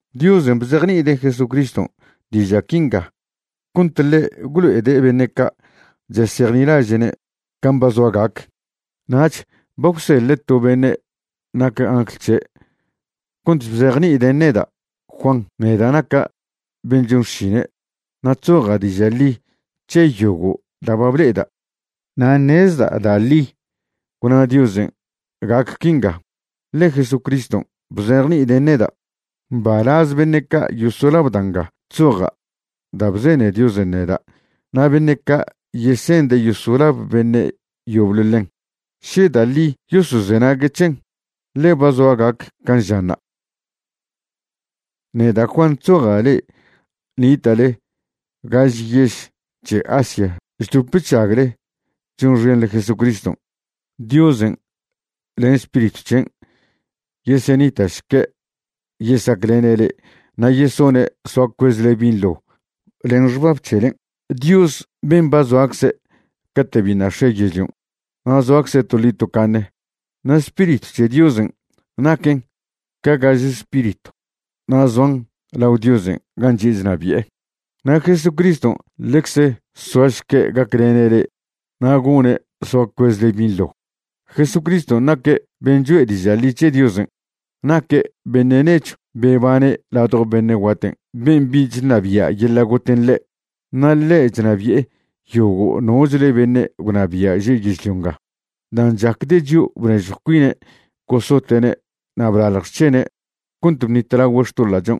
Diosen' bzejni'ide' Jesucriston' diža' quinga cont ḻe' gwlo'ede' beṉe' ca' chesejnilaže'ne' can' ba zoa gac. Nach ba gwseḻe' to beṉe' nac angl c̱he' cont bzejni'iden' neda' Juan, neda' naca' ben' chon xšine'. Na' chzoja' diža' ḻi c̱he yogo' da' ba ble'eda', na' ṉezda' da' ḻi gwna Diosen' gac quinga, ḻe Jesucriston' bzejni'iden' neda'. Mbalaz beṉe' ca' yosolab da' nga chzoja' da' bzene Diosen' neda' na' beṉe' ca' yesende' yosolab beṉe' yoble ḻen, še da' ḻi yosozenague' c̱hen, ḻe ba zoa gac can' žanṉa'. Neda' Juan chzoja' le'e nita'le gaž yež c̱he Asia chdop chžagle chonxenḻe Jesucriston'. Diosen' len Spiritw c̱hen' yesenita'šque' yesaclene' le'e na' yesone' soa cuezle binḻo len xbab c̱helen', Dios ben' ba zoacze' cate' biṉa' x̱e yežlion', na' soacze' toḻi tocaṉe. Na' Spiritw c̱he Diosen' naquen ca gaže spiritw na' zoan lao Diosen' gan' chi'e chnabi'e. Na' Jesucriston' ḻecze soašque' gaclene' le'e na' gone' soa cuezle binḻo. Jesucriston' naque' ben' cho'e diža' ḻi c̱he Diosen'. Naque' beṉe' nechw bebane' ladjo beṉe' guaten' ben' bich ṉabia' yeḻa' goten' ḻe'. Na' ḻe' chnabi'e yogo' nochle beṉe' gwnabia' že' yežlio nga. Dan' chacde' chio' bnežjw cuine' gosote'ne' na' blalj xc̱hene' cont bṉitlagüe' xtoḻa'chon'.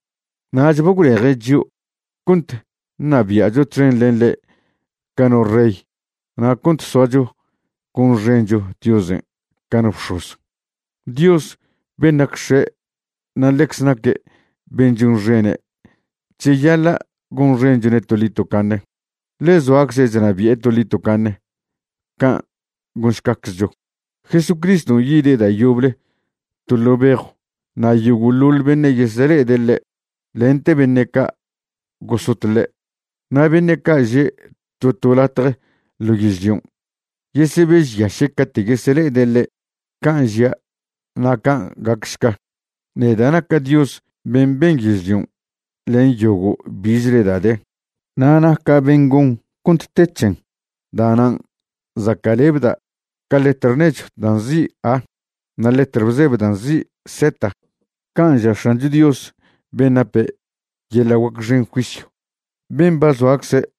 Nach ba gwleje' chio' cont ṉabia'cho txen len ḻe' ca no rey na' cont soacho gonxencho Diosen' ca no bx̱oz, Dios ben' nac X̱e' na' ḻecze naque' ben' chonxene'. Cheyaḻa' gonxenchone' toḻi tocaṉe, ḻe zoacze' chnabi'e toḻi tocaṉe. Can' gonšcaczcho. Jesucriston' yide' da' yoble to ḻo' bejw, na' yogo'ḻoḻ beṉe' yesele'ede' ḻe', lente beṉe' ca' gosot ḻe'. Na' beṉe' ca' že' to to latje ḻo yežlion', yesebežyaše' cate' yesele'ede' ḻe'. Can' žia', na' can' gacšca. “Neda' naca' Dios ben' ben yežlion' len yogo' bichle da' de, na' naca' ben' gon cont te c̱hen. Da'nan' zaca'lebda' ca letr nechw da' nzi' A na' letr bzebe da' nzi' Z.” Can' ža' X̱ancho Dios ben' nape' yeḻa' guac xen juisyw, ben' ba zoacze'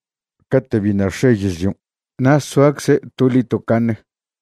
cate' biṉa' x̱e yežlion' na' soacze' toḻi tocaṉe.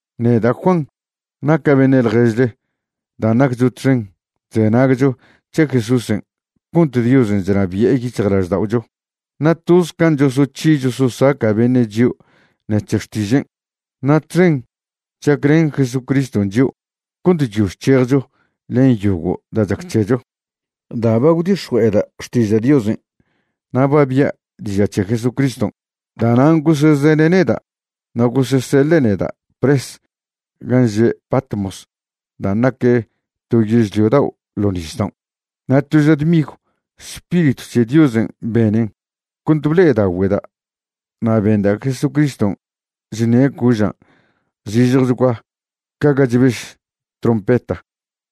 Neda' Juan naca' beṉe' ḻježle dan' naccho txen chzenagcho c̱he Jesúsen' cont Diosen' chnabi'e yic̱hjlažda'ocho, na' toz can' chosoc̱hi chososaca' beṉe' chio' ṉec̱he xtižen', na' txen chaclen Jesucriston' chio' cont chyo chc̱hejcho len yogo' da' chac c̱hecho. Da' ba gwdix̱jue'eda' xtiža' Diosen' na' ba bia' diža' c̱he Jesucriston', da'nan' gosezene' neda' na' goseseḻe' neda' pres gan' že' Patmos dan' nac to yežlio dao' ḻo' nisdaon'. Na' to ža dmigw Spiritw c̱he Diosen' benen cont ble'edaogüeda', na' benda' Jesucriston' chṉe' cožan' zižjechgua ca ga chbež trompeta.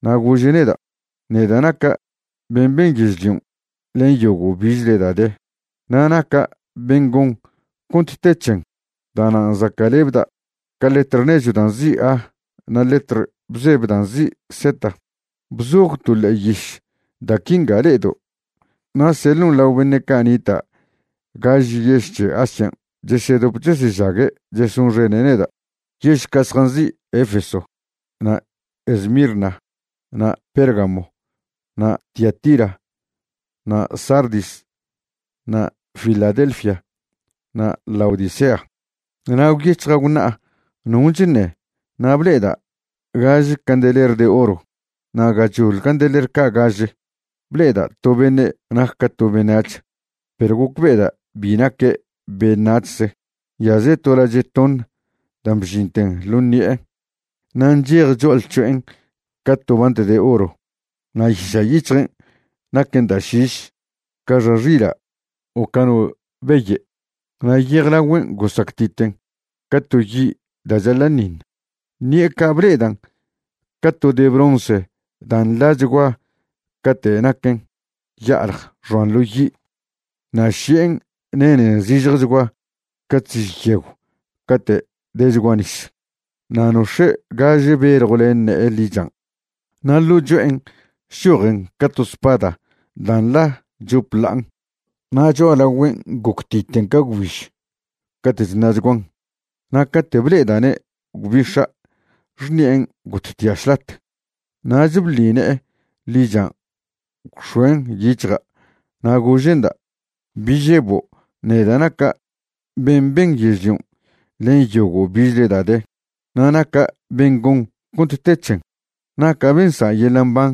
Na' gože' neda': ―Neda' naca' ben' ben yežlion' len yogo' bichle da' de, na' naca' ben' gon cont te c̱hen. Da'nan' zaca'lebda' ca letr nechw da' nzi' A na' letr bzebe da' nzi' Z. Bzoj to ḻe'e yiš da' quinga le'edo', na' seḻon' lao beṉe' ca' nita' gaž yež c̱he Asia chesedop chesežague' chesonxene' neda', yež ca' zjanzi' Efeso, na' Esmirna, na' Pérgamo, na' Tiatira, na' Sardis, na' Filadelfia na' Laodicea. Na' gwyec̱hja' gwṉa'a non' chṉe na' ble'eda' gaže candeler de oro. Na' gachoḻ candeler ca' gaže, ble'eda' to beṉe' nac ca to beṉac̱h perw gocbe'eda' bi naque' beṉac̱hze. Nyaze' to lache' toṉ da' bžinte ḻo ṉi'e na' nchej cho'alc̱ho'en ca to bant de oro. Na' yiša' yic̱hjen' naquen da' šiš ca xa xila' o ca no beye'. Na' yejlagüen' gosactiten ca to yi' da' chaḻa'ṉiṉ. Ṉi'e ca' ble'edan' ca to de bronce da' nḻachgua cate' naquen ya'alj xoan ḻo yi'. Na' ši'en nenen zižjechgua ca chziž yegw cate' dechgua nis. Na' nox̱e' gaže beljw len ne'e ḻichan' na' ḻo' cho'en chchojen ca to spada da' nḻa chop ḻa'an. Na' cho'alagüen' goctiten ca gwbiž cate' chṉa'chguan. Na' cate' ble'eda'ne' gwbix̱a' xṉi'en gottia' šlat. Nach bḻi ne'e ḻichan' gwx̱oen' yic̱hja' na' gože'nda': ―Bi žebo'. Neda' naca' ben' ben yežlion' len yogo' bichle da' de, na' naca' ben' gon cont te c̱hen. Naca' ben' nsa' yeḻa' mban.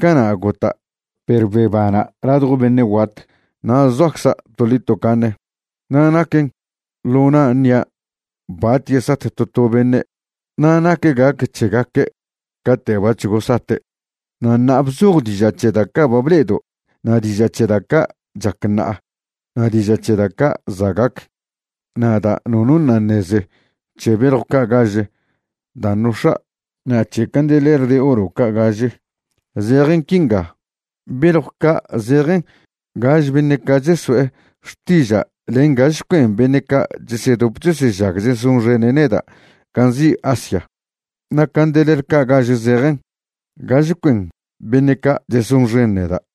Cana' gota' perw bebana' ladjo beṉe' guat na' zoacza' toḻi tocaṉe. Na' naquen ḻo na' ṉia' bat yesat to to beṉe' na' nac gac c̱hegaque' cate' bac̱h gosate'. Na' ṉa'a bzoj diža' c̱he da' ca' ba ble'edo' na' diža' c̱he da' ca' chac ṉa'a na' diža' c̱he da' ca' za' gac. Na' da' nono ṉa' ṉeze c̱he beljw ca' gaže dan' nox̱a' na' c̱he candeler de oro ca' gaže, zejen quinga: beljw ca' zejen gaže beṉe' ca' cheso'e xtiža' len gaže cuen beṉe' ca' chesedop chesežag chesonxene' neda' gan' nzi' Asia. Na' candeler ca' gaže zejen gaž cuen beṉe' ca' chesonxen neda'.